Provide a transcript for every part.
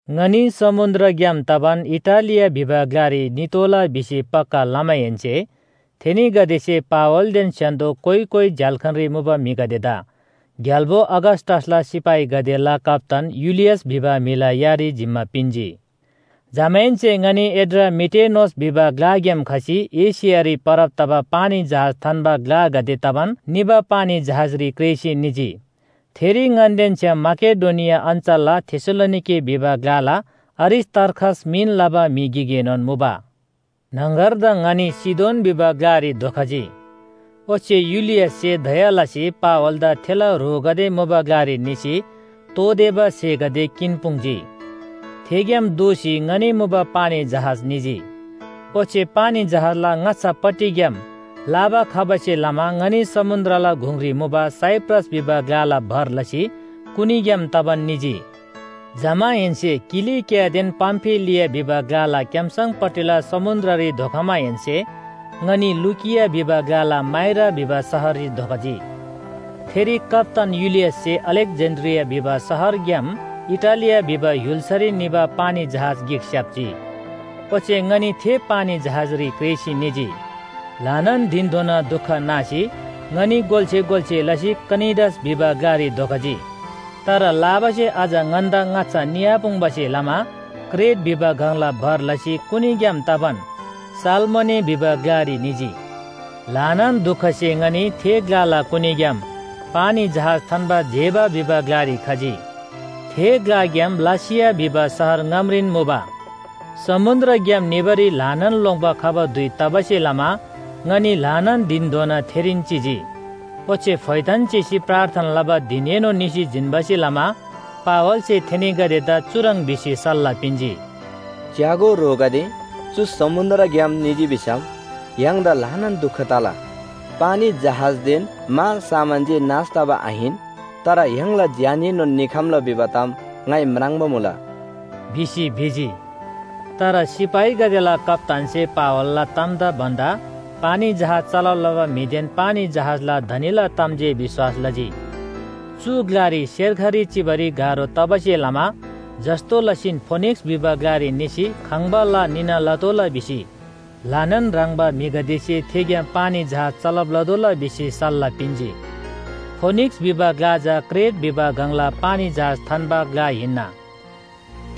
ङनी समुन्‍द्रग्‍याम तबान इटालिया भिबा ग्‍लारी नितोःला भिसी पक्‍का लमाहेन्‍से थेनीगदेसे पावलदेन स्‍य्‍हान्‍दो कोइ कोइ झ्‍याल्‍खानरी मुबा म्‍हिगदेदा ग्‍याल्‍बो अगस्‍टसला सिपाहीगदेला कप्‍तान युलियस भिबा म्‍हिला यारी जिम्‍मा पिन्‍जी। जमाहेन्‍से ङनी एड्रामिटेनोस भिबा ग्‍लाग्‍याम खसी एशियारी परब तबा पानी जहाज थान्‍बा ग्‍लागदे तबान निबा पानी जहाजरी क्रेःसी निजी। थेरी ङन्‍देन छ्‌याम माकेडोनिया अञ्‍चलला थेसलोनिके भिबा ग्‍लाला अरिस्‍तार्खस मिन लबा म्‍हि गिकएनोन मुबा। न्‍हङगरदङ ङनी सीदोन भिबा ग्‍लारी धोखजी। ओच्‍छे युलियससे दया लसी पावलदा थेला ह्रोगदे मुबा ग्‍लारी निसी तोःतेबा स्‍हेगदे किन्‍पुङ्‌जी। थेग्‍याम दोःसी ङनी मुबा पानी जहाज निजी, ओच्‍छे पानी जहाजला ङाच्‍छापट्टिग्‍याम लाबा खबासे लमा ङनी समुन्‍द्रला गुङरी मुबा साइप्रस भिबा ग्‍लाला भर लसी कुनीग्‍याम तबान निजी। जमाहेन्‍से किलिकियादेन पामफिलिया भिबा ग्‍लाला क्‍याम्‍सङपट्टिला समुन्‍द्ररी धोखमाहेन्‍से ङनी लुकिया भिबा ग्‍लाला माइरा भिबा शहररी धोखजी। थेरी कप्‍तान युलियससे अलेक्‍जेन्‍ड्रिया भिबा शहरग्‍याम इटालिया भिबा य्‍हुल्‍सारी निबा पानी जहाज गिक स्‍याप्‍जी। ओच्‍छे ङनी थे पानी जहाजरी क्रेःसी निजी। ल्‍हानान धिनधोना दुख नासी ङनी गोल्‍से गोल्‍से लसी क्‍नीडस भिबा ग्‍लारी धोखजी। तर लाबासे अझ ङन्‍दा ङाच्‍छा निआपुङ्‌बासे लमा क्रेट भिबा गङला भर लसी कुनीग्‍याम तबान सालमोने भिबा ग्‍लारी निजी। ल्‍हानान दुखसे ङनी थे ग्‍लाला कुनीग्‍याम पानी जहाज थान्‍बा जेबा भिबा ग्‍लारी खजी। थे ग्‍लाग्‍याम लासिया भिबा शहर ङामरीन मुबा। समुन्‍द्रग्‍याम निबारी ल्‍हानान लोङ्‌बा खबा धुइ तबासे लमा ङनी ल्‍हानान धिनधोना थेरीन चिजी, ओच्‍छे फोइथान चिसी प्रार्थना लबा धिनएनोन निसी जिन्‍बासे लमा पावलसे थेनीगदेदा चुह्रङ् भिसी सल्‍लाह पिन्‍जी। “च्‍यागो ह्रोगदे, चु समुन्‍द्रग्‍याम निजी भिसम य्‍हाङदा ल्‍हानान दुख तला। पानी जहाजदेन मालसामान जे नाश तबा आहिन, तर य्‍हाङला ज्‍याननोन निखम्‍ला भिबा ताम ङाइ म्राङ्बा मुला” भिसी भिजी। तर सिपाहीगदेला कप्‍तानसे पावलला तामदा भन्‍दा पानी जहाज चलब लबा म्‍हिदेन पानी जहाजला धनीला ताम जे विश्‍वास लजी। चु ग्‍लारी सेर्खरी चिबारी गाह्रो तबासे लमा जस्‍तो लसीन फोनिक्‍स भिबा ग्‍लारी निसी खङ्‍बा ला निना लतोःला भिसी ल्‍हानान ह्रङ्‌बा म्‍हिगदेसे थेग्‍याम पानी जहाज चलब लतोःला भिसी सल्‍लाह पिन्‍जी। फोनिक्‍स भिबा ग्‍ला चा क्रेट भिबा गङला पानी जहाज थान्‍बा ग्‍ला हिन्‍ना।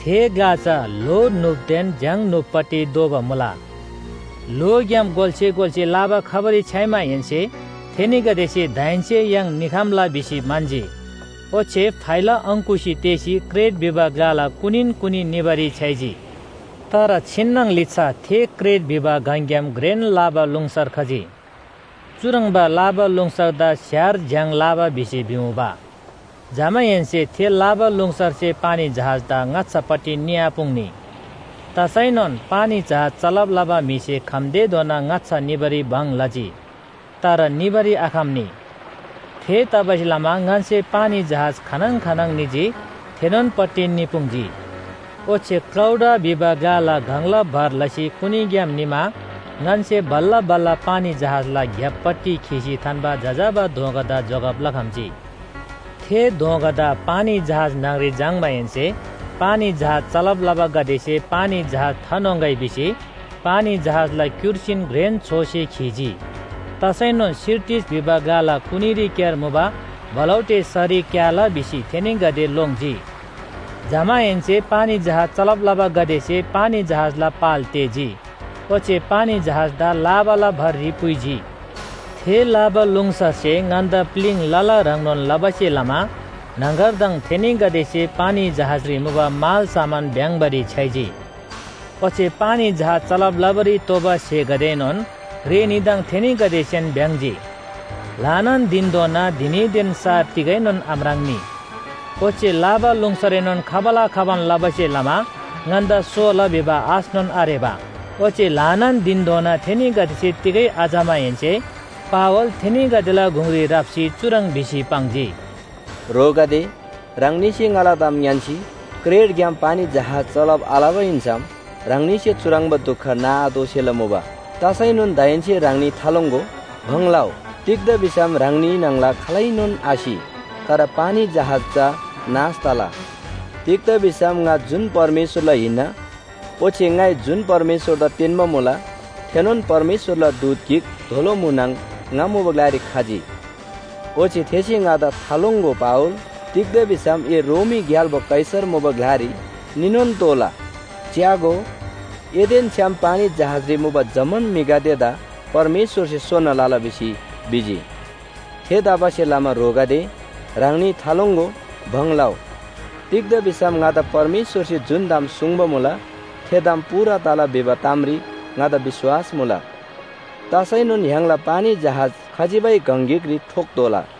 थे ग्‍ला चा ल्‍हो न्‍हुपदेन झ्‍याङ न्‍हुपपट्टि दोबा मुला। ल्‍होग्‍याम गोल्‍से गोल्‍से लाबा खबारी छ्‌याइमाहेन्‍से थेनीगदेसे दाहेन्‍से य्‍हाङ निखम्‍ला भिसी म्‍हन्‍जी, ओच्‍छे फाइला अङ्‌कुसी तेःसी क्रेट भिबा ग्‍लाला कुनीन कुनी निबारी छ्‌याइजी। तर छिन्‍नङ लिच्‍छा थे क्रेट भिबा गङग्‍याम घ्रेन लाबालुङसर खजी। चुह्रङ्बा लाबालुङसरदा स्‍यार झ्‍याङ लाबा भिसी भिमुबा। जमाहेन्‍से थे लाबालुङसरसे पानी जहाजदा ङाच्‍छापट्टि निआपुङ्‌नी। तसैनोन पानी जहाज चलब लबा म्‍हिसे खम्‍तेधोना ङाच्‍छा निबारी भङ लजी, तर निबारी आखम्‍नी। थेतबासेलमा ङन्‍से पानी जहाज खानङ खानङ निजी थेनोन पट्टि निपुङ्‌जी। ओच्‍छे क्‍लौडा भिबा ग्‍लाला गङला भर लसी कुनीग्‍याम निमा ङन्‍से बल्‍ला बल्‍ला पानी जहाजला ग्‍यापपट्टि खीसी थान्‍बा जजाबा दोँगादा जोगब लखम्‍जी। थे दोँगादा पानी जहाज न्‍हङरी झाङ्‌माहेन्‍से पानी जहाज चलब लबागदेसे पानी जहाज थान्‍होङ्‌गै भिसी पानी जहाजला क्‍युर्सीन घ्रेन छोसे खीजी। तसैनोन सिरटिस भिबा ग्‍लाला कुनीरीक्‍यार मुबा बलौटे सरी क्‍याला भिसी थेनीगदे लोङ्जी। जमाहेन्‍से पानी जहाज चलब लबागदेसे पानी जहाजला पाल तेःजी, ओच्‍छे पानी जहाजदा लाबाला भररी पुइजी। थे लाबालुङसरसे ङन्‍दा प्‍लिङ लला ह्रङ्नोन लबासे लमा न्‍हङगरदङ थेनीगदेसे पानी जहाजरी मुबा मालसामान भ्‍याङ्बारी छ्‌याइजी। ओच्‍छे पानी जहाज चलब लबारी तोःबा स्‍हेगदेएनोन रेनीदङ थेनीगदेसेन भ्‍याङ्‍जी। ल्‍हानान धिनधोना धिनीदेन सार तिगैनोन आम्राङ्‌नी। ओच्‍छे लाबालुङसरएनोन खबाला खबान लबासे लमा ङन्‍दा सोला भिबा आशनोन आरेबा। ओच्‍छे ल्‍हानान धिनधोना थेनीगदेसे तिगै आचमाहेन्‍से पावल थेनीगदेला गुङरी राप्‍सी चुह्रङ् भिसी पाङ्जी, “ह्रोगदे, ह्राङनीसे ङाला ताम ङ्‌यान्‍सी क्रेटग्‍याम पानी जहाज चलब आलबा हिन्‍सम ह्राङनीसे चुह्रङ्बा दुख नाआतोःसेला मुबा। तसैनोन दाहेन्‍से ह्राङनी थालोङ्‍गो, भङ लउ। तिग्‍दा भिसम ह्राङनी न्‍हङला खालैनोन आसि। तर पानी जहाज चा नाश तला। तिग्‍दा भिसम ङा जुन परमेश्‍वरला हिन्‍ना ओच्‍छे ङाइ जुन परमेश्‍वरदा तेन्‍बा मुला, थेनोन परमेश्‍वरला दूत गिक दोलो म्‍हुनङ ङा मुबा ग्‍लारी खजी। ओच्‍छे थेसे ङादा ‘थालोङ्‍गो पावल, तिग्‍दा भिसम ए रोमी ग्‍याल्‍बो कैसर मुबा ग्‍लारी निनोन तोःला। च्‍यागो, एदेन छ्‌याम पानी जहाजरी मुबा जम्‍मान म्‍हिगदेदा परमेश्‍वरसे सोना लला’ भिसी भिजी। थेतबासेलमा ह्रोगदे, ह्राङनी थालोङ्‍गो, भङ लउ। तिग्‍दा भिसम ङादा परमेश्‍वरसे जुन ताम सुङ्बा मुला थे ताम पूरा तला भिबा तामरी ङादा विश्‍वास मुला। तसैनोन य्‍हाङला पानी जहाज खजिबै गङ गिकरी ठोक्‍तोःला।”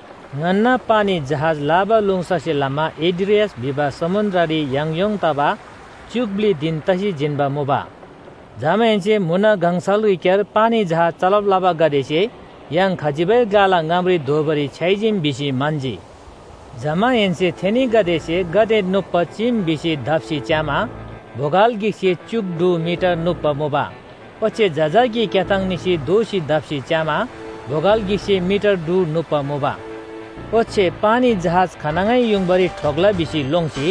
ङन्‍ना पानी जहाज लाबालुङसरसे लमा एड्रियास भिबा समुन्‍द्ररी याङयोङ तबा च्‍युक ब्‍लि धिन तसी जिन्‍बा मुबा। जमाहेन्‍से म्‍हुन गङसलरीक्‍यार पानी जहाज चलब लबागदेसे य्‍हाङ खजिबै ग्‍लाला ङामरी धोबारी छ्‌याइजीम भिसी म्‍हन्‍जी। जमाहेन्‍से थेनीगदेसे गाते नुप्‍बा चीम भिसी दप्‍सी च्‍यामा बोगल गिकसे च्‍युक ढु मिटर नुप्‍बा मुबा ओच्‍छे जजाकी क्‍याथाङ निसी दोःसी दप्‍सी च्‍यामा बोगल गिकसे मिटर ढु नुप्‍बा मुबा। ओच्‍छे पानी जहाज खानङै युङबारी ठोक्‍ला भिसी लोङ्सी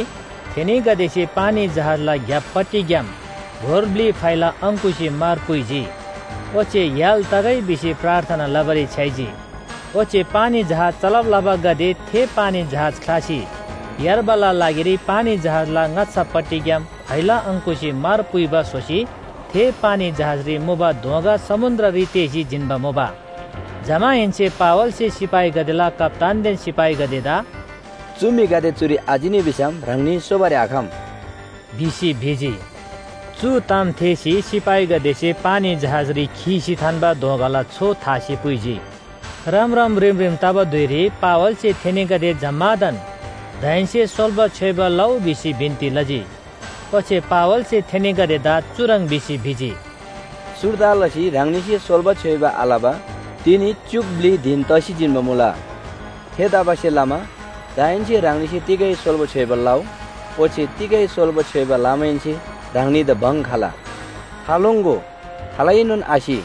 थेनीगदेसे पानी जहाजला ग्‍यापपट्टिग्‍याम गोर ब्‍लि फाइला अङ्‌कुसी मार पुइजी, ओच्‍छे य्‍हाल तगै भिसी प्रार्थना लबारी छ्‌याइजी। ओच्‍छे पानी जहाज चलब लबागदे थे पानी जहाज ख्‍लासी यार्बाला लागिरी पानी जहाजला ङाच्‍छापट्टिग्‍याम फाइला अङ्‌कुसी मार पुइबा स्‍होसी थे पानी जहाजरी मुबा दोँगा समुन्‍द्ररी तेःसी जिन्‍बा मुबा। जमाहेन्‍से पावलसे सिपाहीगदेला कप्‍तानदेन सिपाहीगदेदा “चु म्‍हिगदे चुरी आचिनी भिसम ह्राङनी सोबारी आखम” भिसी भिजी। चु ताम थेःसी सिपाहीगदेसे पानी जहाजरी खीसी थान्‍बा दोँगाला छो थासी पुइजी। रमरम रिमरिम तबा धुइरी पावलसे थेनीगदे जम्‍मादान दाहेन्‍से सोल्‍बा छ्‌योइबा लउ भिसी बिन्‍ती लजी। ओच्‍छे पावलसे थेनीगदेदा चुह्रङ् भिसी भिजी, “सुर्दा लसी ह्राङनीसे सोल्‍बा छ्‌योइबा आलबा तिनी च्‍युक ब्‍लि धिन तसी जिन्‍बा मुला। थेतबासेलमा दाहेन्‍से ह्राङनीसे तिगै सोल्‍बा छ्‌योइबा लउ। ओच्‍छे तिगै सोल्‍बा छ्‌योइबा लमाहेन्‍से ह्राङनीदा भङ खला, थालोङ्‍गो, खालैनोन आसि।”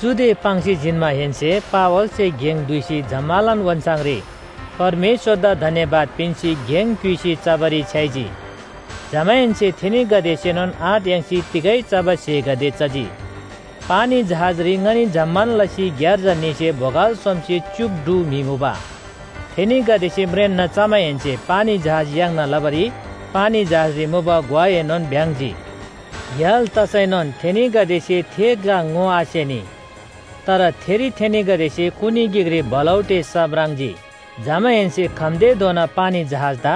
चुदे पाङ्सी जिन्‍माहेन्‍से पावलसे गेङ दुइसी जम्‍मालान ओन्‍छाङरी परमेश्‍वरदा धन्‍यवाद पिन्‍सी गेङ क्‍युइसी चबारी छ्‌याइजी। जमाहेन्‍से थेनीगदेसेनोन आँट याङ्सी तिगै चबा स्‍हेगदे चजी। पानी जहाजरी ङनी जम्‍मान लसी ग्‍यार्जा न्‍हीसे बोगल सोमसे च्‍युक ढु म्‍हि मुबा। थेनीगदेसे म्रेन्‍ना चमाहेन्‍से पानी जहाज याङ्ना लबारी पानी जहाजरी मुबा ग्‍वाएनोन भ्‍याङ्‍जी। य्‍हाल तसैनोन थेनीगदेसे थे ग्‍ला ङोआसेनी। तर थेरी थेनीगदेसे कुनी गिकरी बलौटे स म्राङ्जी। जमाहेन्‍से खम्‍तेधोना पानी जहाजदा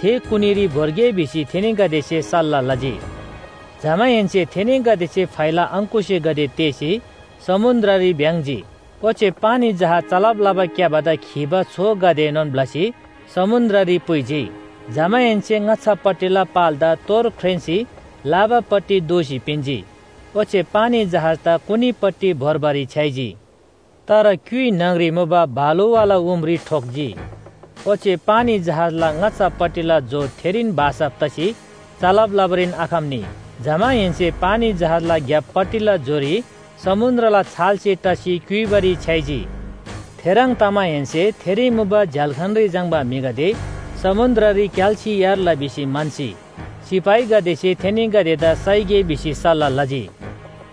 थे कुनीरी भोर्गे भिसी थेनीगदेसे सल्‍लाह लजी। जमाहेन्‍से थेनीगदेसे फाइला अङ्‌कुसीगदे तेःसी समुन्‍द्ररी भ्‍याङ्‍जी, ओच्‍छे पानी जहाज चलब लबा क्‍याबादा खीबा छोगदेएनोन ब्‍लसी समुन्‍द्ररी पुइजी। जमाहेन्‍से ङाच्‍छापट्टिला पालदा तोर ख्रेन्‍सी लाबापट्टि दोःसी पिन्‍जी, ओच्‍छे पानी जहाजदा कुनीपट्टि भोर्बारी छ्‌याइजी। तर क्‍युइ न्‍हङरी मुबा बालुवाला उमरी ठोक्‍जी, ओच्‍छे पानी जहाजला ङाच्‍छापट्टिला जो थेरीन भासब तसी चलब लबारीन आखम्‍नी। जमाहेन्‍से पानी जहाजला ग्‍यापपट्टिला जोरी समुन्‍द्रला छालसे टसी क्‍युइबारी छ्‌याइजी। थेह्रङ् तमाहेन्‍से थेरी मुबा झ्‍याल्‍खानरी झाङ्‌बा म्‍हिगदे समुन्‍द्ररी क्‍याल्‍सी यार्ला भिसी म्‍हन्‍सी सिपाहीगदेसे थेनीगदेदा साइगे भिसी सल्‍लाह लजी।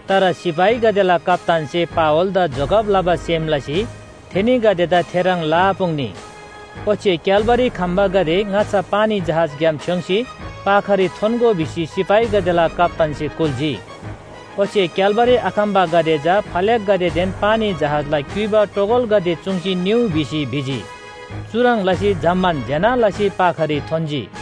तर सिपाहीगदेला कप्‍तानसे पावलदा जोगब लबा सेम लसी थेनीगदेदा थेह्रङ् लआपुङ्नी। ओच्‍छे क्‍याल्‍बारी खम्‍बागदे ङाच्‍छा पानी जहाजग्‍याम छ्‌योङ्‌सी पाखारी थोन्‍गो भिसी सिपाहीगदेला कप्‍तानसे कुल्‍जी। ओच्‍छे क्‍याल्‍बारी आखम्‍बागदे चा फल्‍याकगदेदेन पानी जहाजला क्‍युइबा टोगलगदे चुङ्सी निउ भिसी भिजी। चुह्रङ् लसी जम्‍मान ज्‍यना लसी पाखारी थोन्‍जी।